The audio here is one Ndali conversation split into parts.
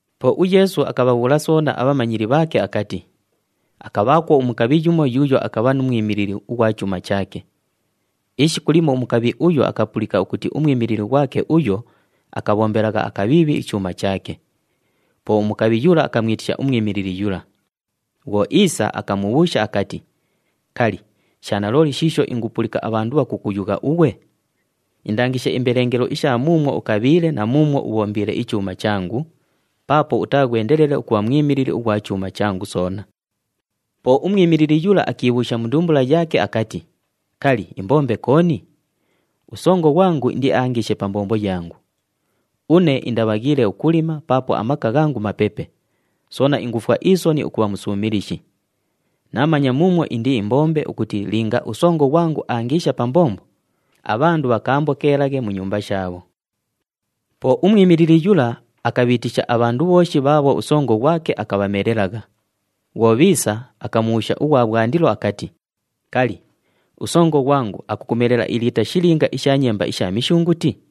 Po uYeesu akabhabhuula soona abhamanyili bhaake akati, “Akabhaakwo umukabhi yumo yuuyo akabha nu mwimilili ughwa chuuma chaake. Ishiku limo umukabhi uyo akapulika ukuti umwimilili ghwake uyo akabhombelagha akabhiibhi ichuuma chaake. Po umukabhi yula akamwitisha umwimilili yula. Bhwo iisa, akamubhuusha akati, ‘Kali, sha nalooli shiisho ingupulika abhandu bhakukuyugha ughwe? Indangishe imbelengelo isha muumwo ukabhiile na muumwo ubhombiile ichuuma changu, paapo utaaghwendelele ukubha mwimilili ughwa chuuma changu soona.’ “Po umwimilili yula akiibhuusha mu ndumbula yaake akati, ‘Kali, imbombe kooni? Usongo ghwangu indiaangiishe pa mbombo yangu. Une indabhaghiile ukulima paapo amaka ghangu mapepe, soona ingufwa isoni ukubha musuumilishi. Naamanya muumwo indiimbombe ukuti linga usongo ghwangu aangiisha pa mbombo, abhandu bhakaambokeelaghe mu nyumba shaabho.’ “Po umwimilili yula akabhiitisha abhandu bhooshi bhaabho usongo ghwake akabhamelelagha. Bhwo bhiisa, akamubhuusha ughwa bhwandilo akati, ‘Kali, usongo ghwangu akukumelela iliita shilinga isha nyemba isha mishunguti?’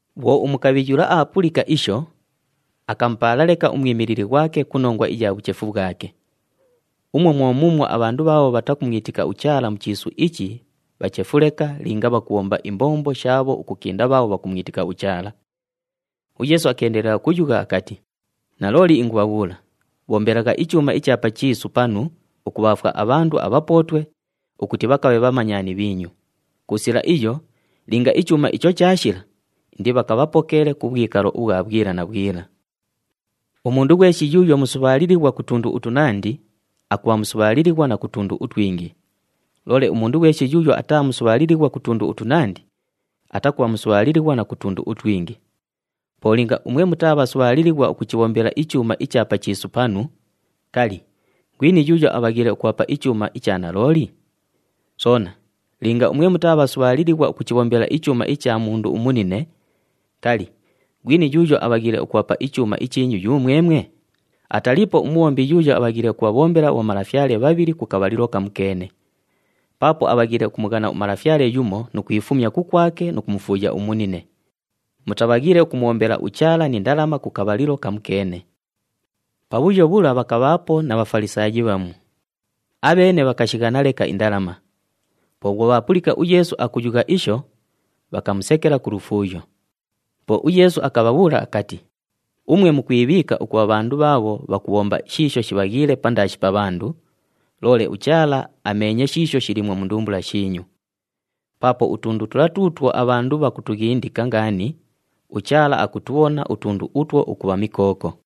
“Bhwo umukabhi yula aapulika isho, akamupaala leka umwimilili ghwake ku nongwa iya bhuchefu bhwake. Umwo mwo muumwo abhandu bhaabho bhatakumwitika uChaala mu chiisu ichi bhachefu leka linga bhakubhomba imbombo shaabho ukukinda bhaabho bhakumwitika uChaala.” UYeesu akeendelela ukuyugha akati, “Nalooli ingubhabhuula, bhombelagha ichuuma icha pa chiisu panu ukubhaafwa abhandu abhapootwe ukuti bhakabhe bhamanyani bhiinyu. Ku sila iyo, linga ichuuma icho chaashila, indibhakabhapokeele ku bhwikalo ubhwa bhwila na bhwila. “Umundu ghweshi yuuyo musubhaalilighwa ku tundu utunandi, akubha musubhaalilighwa na ku tundu utwingi. Loole umundu ghweshi yuuyo ataa musubhaalilighwa ku tundu utunandi, atakubha musubhaalilighwa na ku tundu utwingi. Po linga umwe mutaa bhasubhaalilighwa ukuchibhombela ichuuma icha pa chiisu panu, kali, ghwini yuuyo abhaghiile ukubhapa ichuuma icha nalooli? Soona linga umwe mutaa bhasubhaalilighwa ukuchibhombela ichuuma icha mundu umunine, kali, ghwini yuuyo abhaghiile ukubhapa ichuuma ichiinyu yumwemwe? Ataliipo umubhombi yuuyo abhaghiile ukubhabhombela abhomalafyale bhabhili ku kabhalilo kamukeene. Paapo abhaghiile ukumughana umalafyale yumo nu kwifumya kukwake nu kumufuuya umunine. Mutabhaghiile ukumubhombela uChaala ni ndalama ku kabhalilo kamukeene!” Pabhuyo bhula pakabhaapo na Bhafalisaayi bhamu. Abheene bhakashighana leka indalama. Po bhwo bhaapulika uYeesu akuyugha isho, bhakamusekela ku lufuuyo. Po uYeesu akabhabhuula akati, “Umwe mukwibhiika ukubha bhandu bhaabho bhakubhomba shiisho shibhaghiile pandaashi pa bhandu, loole uChaala ameenye shiisho shiliimwo mu ndumbula shiinyu. Paapo utundu tula tuutwo abhandu bhakutughindika ngaani, uChaala akutubhona utundu utwo ukubha mikooko.”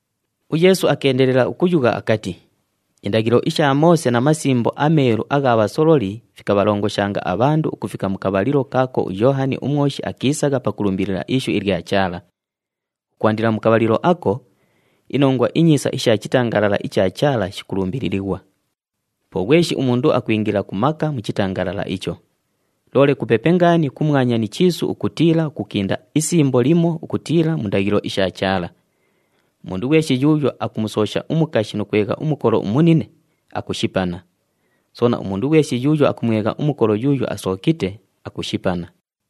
UYeesu akeendelela ukuyugha akati, “Indaghilo isha Moose na Masimbo aMeelu agha bhasololi fikabhalongoshanga abhandu ukufika mu kabhalilo kaako uYoohani uMwoshi akiisagha pakulumbilila ishu ilya Chaala. Ukwandila mu kabhalilo ako, iNongwa iNyiisa isha chitangalala icha Chaala shikulumbililighwa. Po ghweshi umundu akwingila ku maka mu chitangalala icho. Loole kupepe ngaani kumwanya ni chiisu ukutiila ukukinda isimbo limo ukutiila mu ndaghilo isha Chaala. “Umundu ghweshi yuuyo akumusoosha umukashi nu kwegha umukolo umunine, akushipana. Soona, umundu ghweshi yuuyo akumwegha umukolo yuuyo asookite, akushipana.”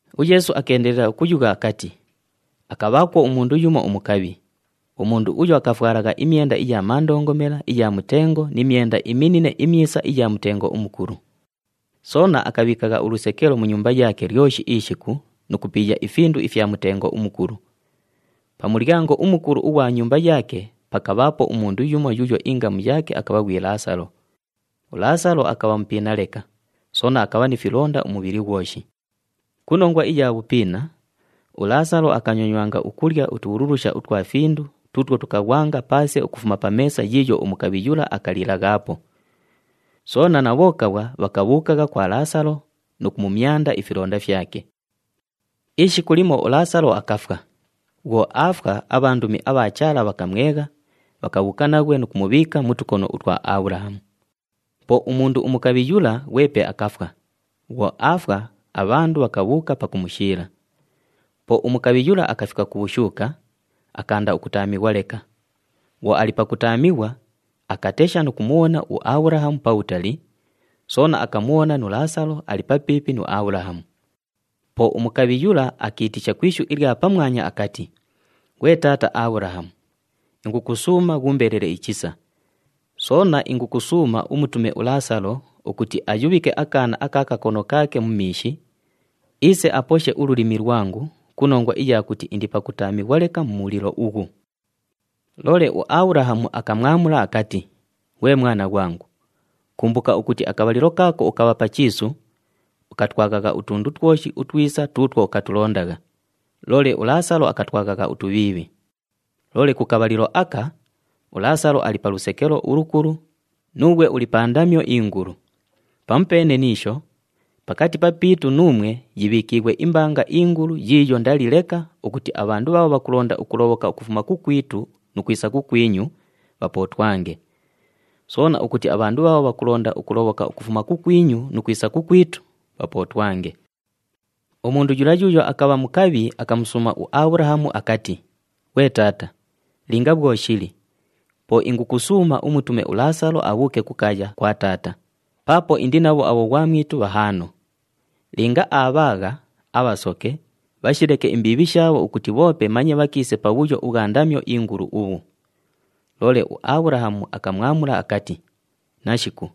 UYeesu akeendelela ukuyugha akati, “Akabhaakwo umundu yumo umukabhi. Umundu uyo akafwalagha imyenda iya mandongomela iya mutengo ni myenda iminine imyisa iya mutengo umukulu. Soona akabhiikagha ulusekelo mu nyumba yaake lyoshi ishiku nu kupiiya ifindu ifya mutengo umukulu. Pa mulyango umukulu ughwa nyumba yaake pakabhaapo umundu yumo yuuyo ingamu yaake akabha ghwi Laasalo. ULaasalo akabha mupiina leka, soona akabha ni filonda umubhili ghwoshi. Ku nongwa iya bhupiina, uLaasalo akanyonyangwa ukulya utubhululusha utwa findu tuutwo tukaghwanga paase ukufuma pa meesa yiiyo umukabhi yula akalilaghaapo. Soona na bhokabhwa bhakabhuukagha kwa Laasalo nu kumumyanda ifilonda fyake. “Ishiku limo uLaasalo akafwa. Bhwo aafwa, abhandumi abha Chaala bhakamwegha, bhakabhuuka naghwe nu kumubhiika mu tukono utwa Abhulahamu. Po umundu umukabhi yula ghwepe akafwa. Bhwo aafwa, abhandu bhakabhuuka pakumushiila. Po umukabhi yula akafika ku bhushuuka, akaanda ukutaamighwa leka. Bhwo ali pakutaamighwa, akatesha nu kumubhona uAbhulahamu pabhutali, soona akamubhona nu Laasalo ali papiipi nu Abhulahamu. Po umukabhi yula akiitisha ku ishu ilya pamwanya akati, ‘Ghwe taata Abhulahamu, ingukusuuma ghuumbelele ichisa, soona ingukusuuma umutume uLaasalo ukuti ayubhike akaana aka kakono kaake mu miishi, iise aposhe ululimi lwangu ku nongwa iya kuti indi pakutaamighwa leka mu mulilo ughu.’ “Loole uAbhulahamu akamwamula akati, ‘Ghwe mwana ghwangu, kumbuka ukuti akabhalilo kaako ukabha pa chiisu, ukatwaghagha utundu twoshi utwisa tuutwo ukatulondagha, loole uLaasalo akatwaghagha utubhiibhi. Loole ku kabhalilo aka, uLaasalo ali pa lusekelo ulukulu, nuughwe uli pa ndamyo ingulu. Pamupeene ni isho, pakati papiitu nuumwe yibhiikiighwe imbanga ingulu yiiyo ndali leka ukuti abhandu bhaabho bhakulonda ukulobhoka ukufuma kukwitu nu kwisa kukwinyu, bhapootwange. Soona ukuti abhandu bhaabho bhakulonda ukulobhoka ukufuma kukwinyu nu kwisa kukwitu, bhapootwange.’ “Umundu yula yuuyo akabha mukabhi akamusuuma uAbhulahamu akati, ‘Ghwe taata, linga bhwo shili, po ingukusuuma umutume uLaasalo abhuuke kukaaya kwa taata, paapo indi nabho abhoghwamwitu bhahaano. Linga aabhaagha, abhasoke, bhashileke imbiibhi shaabho ukuti bhoope manye bhakiise pabhuyo ubhwa ndamyo ingulu ubhu.’ Loole uAbhulahamu akamwamula akati, ‘Nashiku,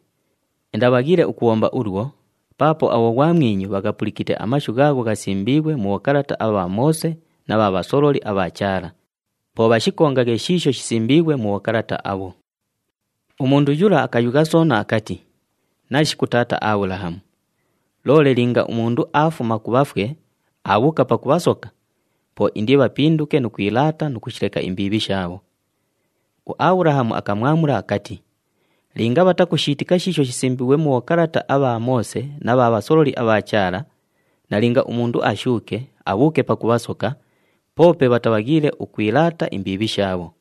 indabhaghiile ukubhomba ulwo paapo abhoghwamwinyu bhaghapulikite amashu ghaagho ghasimbiighwe mu bhokalata abha Moose na bha bhasololi abha Chaala. Po bhashikongaghe shiisho shisimbiighwe mu bhokalata abho.’ “Umundu yula akayugha soona akati, ‘Nashiku taata Abhulahamu! Loole linga umundu aafuma ku bhafwe, aabhuuka pakubhasoka, po indibhapinduke nu kwilaata nu kushileka imbiibhi shaabho.’ UAbhulahamu akamwamula akati, ‘Linga bhatakushiitika shiisho shisimbiighwe mu bhokalata abha Moose na bha bhasololi abha Chaala, nalinga umundu ashuuke, abhuuke pakubhasoka, poope bhatabhaghiile ukwilaata imbiibhi shaabho.’”